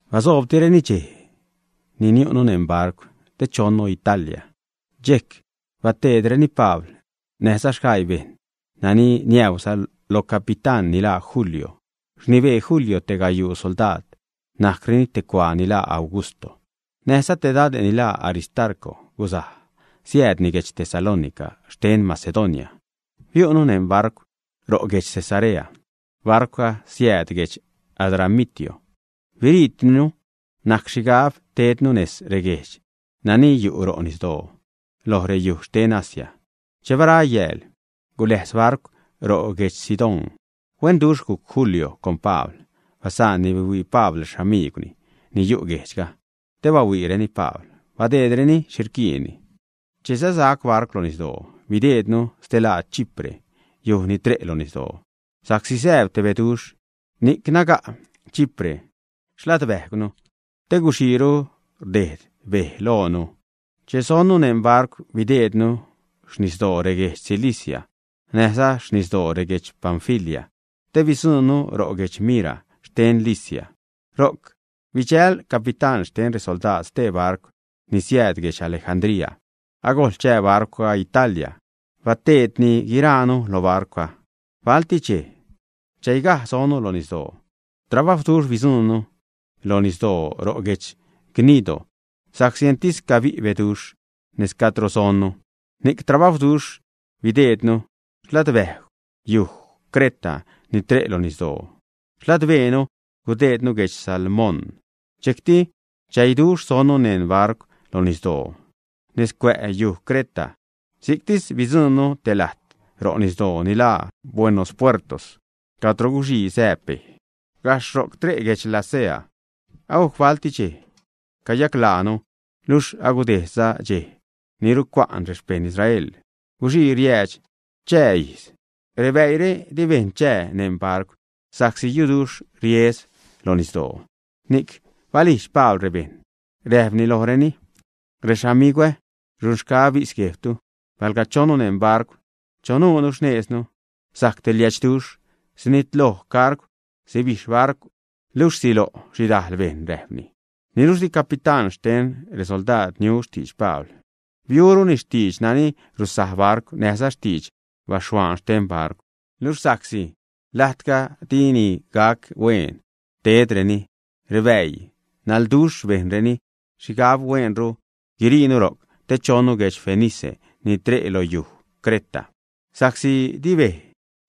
Basoobtireni dxej ni niu'nu neṉ barcw te chonnu Italia. Dxejc bateedreni Pabl näjza sgaii bejṉ nani niäuza lo capitán ni laa Julio. Rnibee Julio te gayuu soldaad, najcreni te cuaa ni laa Augusto. Näjza te dade' ni laa Aristarco guzaj, siäädni guedx Tesalónica xten Macedonia. Biu'nu neṉ barcw ro' guedx Cesarea. Barcwga siääd guedx Adramitio. Biriitinu, najc xhigab teednu nez reguejdx nani yu' ro' nisdoo lo reyuj xten Asia. Che bara yääl guläjz barcw ro' guedx Sidón. Huenduxh gujc Julio con Pabl, basaanni bihuii Pabl rexamigwni ni yu' guejdxga te bahuiireni Pabl, badeedreni xhi rquiinni. Che säsac barcw lo nisdoo, bideednu stelaad Chipre, yuj ni tre' lo nisdoo, sa'csi sääb te beduxh, ni'c naga' Chipre xladbäjgwnu, te guxiiru rda' bej loonu. Che sonnu neṉ barcw, bideednu xnisdoo reguedx Cilicia näjza xnisdoo reguedx Panfilia, te bidzuṉnu ro' guedx Mira xten Licia. Ro'c bidxäjl capitán xten resoldaad stee barcw ni siääd guedx Alejandría. Agojl chää barcwga Italia. Bateedtini guiraanu lo barcwga. Balti dxej chäigaj sonnu lo nisdoo. Trabajwduxh bidzuṉnu lo nisdoo ro' guedx Gnido, sa'csi entis cabi' beduxh nez cadro sonnu. Ni'c trabajwduxh bideednu xladbäjgw yuj Creta ni tre' lo nisdoo xladbeenu. Gudejdnu guedx Salmón. Dxejcti chäiduxh sonnu neṉ barcw lo nisdoo nez cuä' yu Creta; si'ctis gujc bidzuṉnu te lajt ro' nisdoo ni laa Buenos Puertos cadro guxii sääb bej. Gajxh ro'c tre' guedx Lasea. Agujc balti dxej cayaclaanu, luxh agudejdza dxej ni rucua'n rexpejṉ Israel, guxii riäädx chaa ijz. Rebäire di bejṉ chää neṉ barcw sa'csi yuduxh riesgw lo nisdoo, ni'c balijdx Pabl rebejṉ, räjpni lojreni: ―Rexamigwä, runxgaä bis guejbtu, palga chonnu neṉ barcw chanuunu xnejznu, sajc te liädxduxh. Sinitloj cargw, sibijxh barcw, luxh silo' xhidajl bejṉ, ―räjpni. Niluxh di capitán xten resoldaad niu xtidx Pabl. Biuruni xtidx nani rusaj barcw näjza xtidx baxhuaan xten barcw. Luxh sa'csi lajtga dini gajc huen tedreni rebäii naḻduxh, bejnreni xhigab hueenru guiriinu ro'c te chonnu guedx Fenice ni tre'za lo yu Creta, sa'csi di bej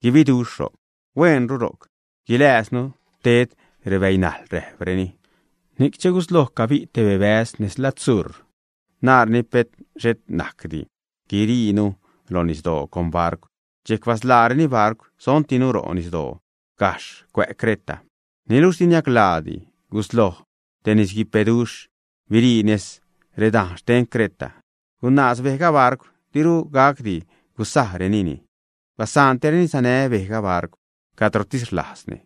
guibiduxh ro'c. Hueenru ro'c guilääznu ted rebäinajḻ, rajpreni. Ni'c che gusloj cabi' te bebäz nez lad sur, naareni pet xhet najcdi guiriinu lo nisdoo con barcw. Dxejc basḻaareni barcw, sontinu ro' nisdoo gajxh cuä' Creta. Niluxh di niaclaa gusloj te nisguipeduxh birii nez redajn xten Creta. Gunaaz bejga barcw, diru gacdi gusajrenini. Basa'ntireni sanä bejga barcw cadrotis rlajzni.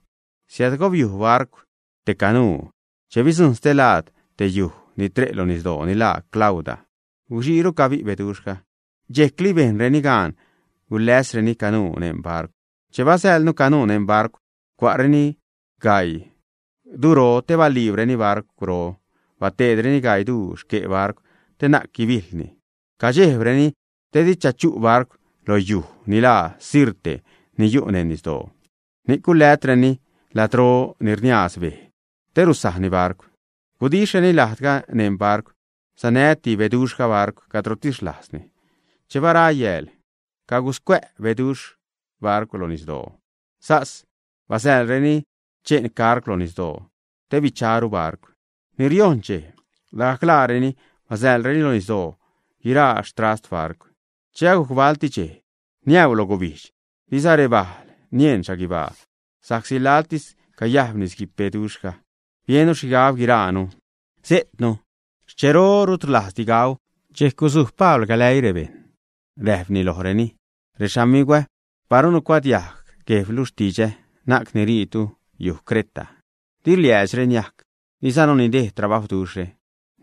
Siädgobiuj barcw te canuu. Che bidzuṉnu stelaad te yuje' ni tre' lo nisdoo ni laa Clauda, guxiiru cabi' beduxhga. Dxejcli bejnreni gaan guläsreni canuu neṉ barcw. Che basäḻnu canuu neṉ barcw, cua'reni gaii duro te baliibreni barcwro, bateedreni gaii duu xque' barcw te na'c guibiḻni. Cadxejbreni te di chachu' barcw lo yujxh ni laa Sirte ni yu' neṉ nisdoo. Ni'c guläjtreni ladro ni rniaaz bej te rusajni barcw, gudixhreni lajdga neṉ barcw. Sanäti beduxhga barcw cadrotis rlajzni. Che bara yääl caguscuä' beduxh barcw lo nisdoo. Sas basäḻreni che'n cargw lo nisdoo te bicharu barcw. Ni riojṉ dxej, lagajc laareni basäḻreni lo nisdoo guiraa xtrast barcw. Che agujc balti dxej niäu lo gubijdx, diza rebale' nieṉ xhaguibaa sa'csi laḻtis cayajb nisguipeduxhga, biennu xhigab guiraanu sejtnu. Xchero rut rlajzdi gau. Dxejc gusuj Pabl galäii rebejṉ räjpni lojreni: ―Rexamigwä, paru nucuadiajg guejbtu xtidxä, na'c niriitu xyuj Creta, di liäädxre niajc, dizanu nidejd trabajwduxhre.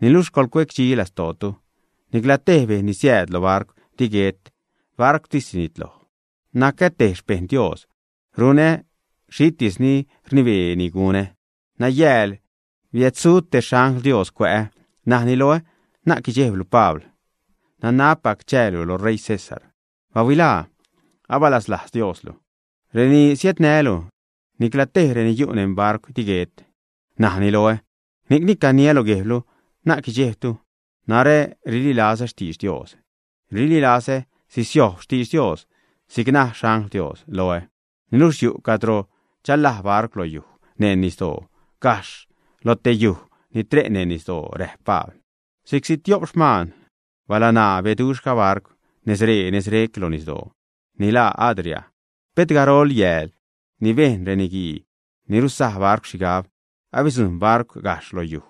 Niluxh coḻcuecdxi lastootu. Niclatej bejṉ ni siääd lo barcw di guet. Barcwtis sinitloj. Nacä te xpejṉ Dios, runä xhitis ni rnibeeni gunä. Nayääl biädsuj te xangl Dios cuä'ä, najni loä: “Na'c guidxejblu Pabl. Nanabpac chäälu lo ṟeii César. ¡Bahuilaa! Abasalajz Dioslu reni siädnälu; nicla tej reni yu' neṉ barcwre di guet”, najni loä. Ni'cni caniä lo guejbtu, na'c guidxejbtu. Narä rililazä xtidx Dios. Rililazä sisiojb xtidx Dios si'c ni naj xangl Dios loä. Niluxh yu' cadro chalaj barcw lo yujxh neṉ nisdoo gajxh lo te yuje' ni tre' neṉ nisdoo ―räjp Pabl. Si'cti tiop xman balaṉaa beduxhga barcw nezre, nezrec lo nisdoo ni laa Adria. Pet garol yääl ni bejn reniguii ni ruzaj barcw xhigab abidzujṉ barcw gajxh lo yuj,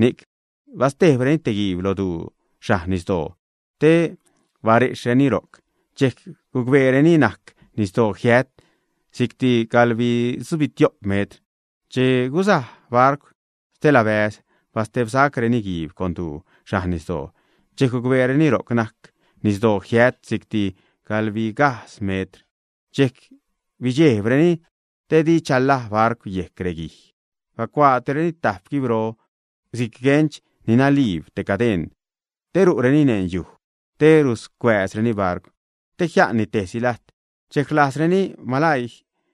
ni'c bastejbreni te guiib lo duu xhajn nisdoo, te barexhreni ro'c, dxejc gucbeereni najc nisdoo jiät si'cti gaḻbitzubixho'p metr. Che guzaj barcw stelabäze', bastebsacreni guiib con duu xajn nisdoo, dxejc gucbeereni ro'c najc nisdoo jiät si'cti gaḻbigajdz metr. Dxejc bidxejbreni te di chalaj barcw yejc reguij. Bacuaatireni tajp guibro si'c guench ni naliib te cadeṉ te ru'reni neṉ yujxh te ruscuääzreni barcw, te jia'nni tejsi lajt. Dxejc rlajzreni malaii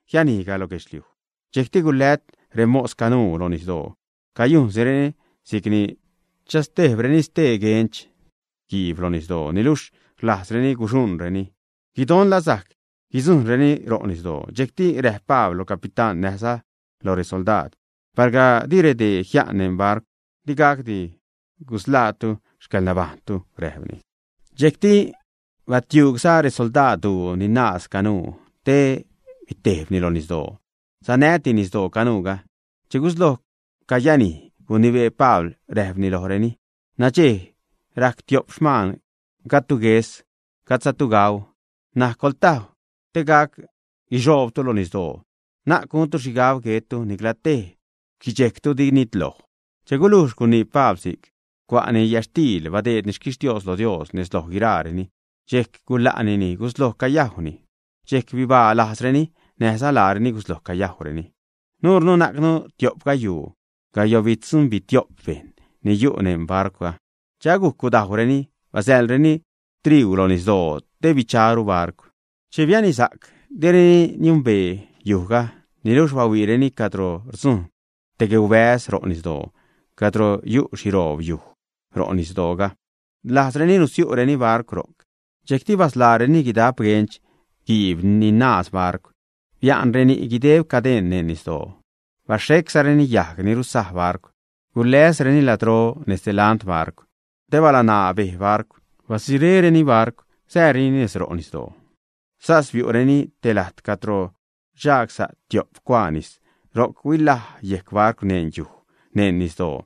jianijga lo guedxliuj. Dxejcti gulät remos canuu lo nisdoo cayujnsireni si'cni chastejbreni stee guench guiib lo nisdoo, niluxh rlajzreni guxuṉreni guidon la sajc guidzujṉreni ro' nisdoo. Dxejcti räjp Pabl lo capitán näjza lo resoldaad: ―Palga di redee jia'n neṉ barcw, di gacdi gusḻaatu xcäḻnabajṉtu ―räjpni. Dxejcti batiugya' resoldaad duu ni naaz canuu te bitejbni lo nisdoo, sanäti nisdoo canuuga. Che gusloj cayanij, gunibee Pabl, räjpni lojreni: ―Nadxej rajc tiop xman gajdtu gues, gajdzatu gau. N̲aj coḻtajw te gac guixoobtu lo nisdoo. Na'c guntu xhigab guettu, nicla tej xquidxejctu di nitloj. Che gulujx gunii Pabl si'c, cua'ni yätxtiil, badeedni xquixtios lo Dios nez loj guiraareni. Dxejc gula'nini, gusloj cayajwnini. Dxejc bibaa-lajzreni, näjza laareni gusloj cayajwreni. Nuunu najcnu tiop gayuu gayoṉbitzubixho'p bejṉ ni yu' neṉ barcwga. Che agujc gudajwreni, basäḻreni triuu lo nisdoo te bicharu barcw. Che bianisac, direni niembee yujga, niluxh bahuiireni cadro rdzujṉ te gueubäz ro' nisdoo cadro yu' xhiroob yujxh ro' nisdooga. Rlajzreni nusiu'reni barcw ro'c. Dxejcti basḻaareni guidap guench guiib ni naaz barcw, bia'nreni guideb cadeṉ neṉ nisdoo, baxheczareni yajg ni ruzaj barcw, guläszareni ladro nez delant barcw te balaṉaa bej barcw. Badzuréreni barcw sääreni nez ro' nisdoo. Sas biu'reni te lajt cadro rdxagsa' tiop cuaa nis. Ro'c huilaj yejc barcw neṉ yujxh neṉ nisdoo,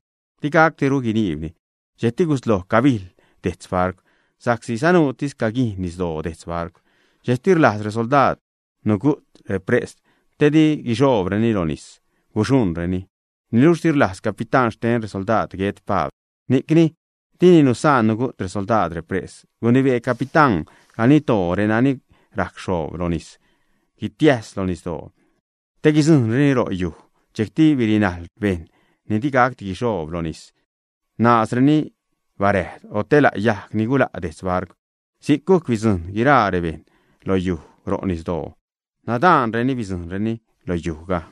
digacdiru guiniibni. Dxejcti gusloj cabijḻ dejtz barcw sa'csi sanuutis caguijn nisdoo detz barcw. Dxejcti rlajz resoldaad nugu't repres te di guixoobreni lo nis guxuṉreni. Niluxh di rlajz capitán xten resoldaad guet Pabl, ni'c dini nusaan nugu't resoldaad repres. Gunibee capitán ganiddoo renani rajc rxoob lo nis guitiäjs lo nisdoo te guidzujṉreni lo yujxh. Dxejcti birinajl rebejṉ ni digacdi guixoob lo nis, naazreni barajd o te la' yajg ni gula' detz barcw. Si'c gujc bidzujṉ guiragajc rebejṉ lo yujxh ro' nisdoo. Nadaanreni bidzujṉreni lo yujxhga.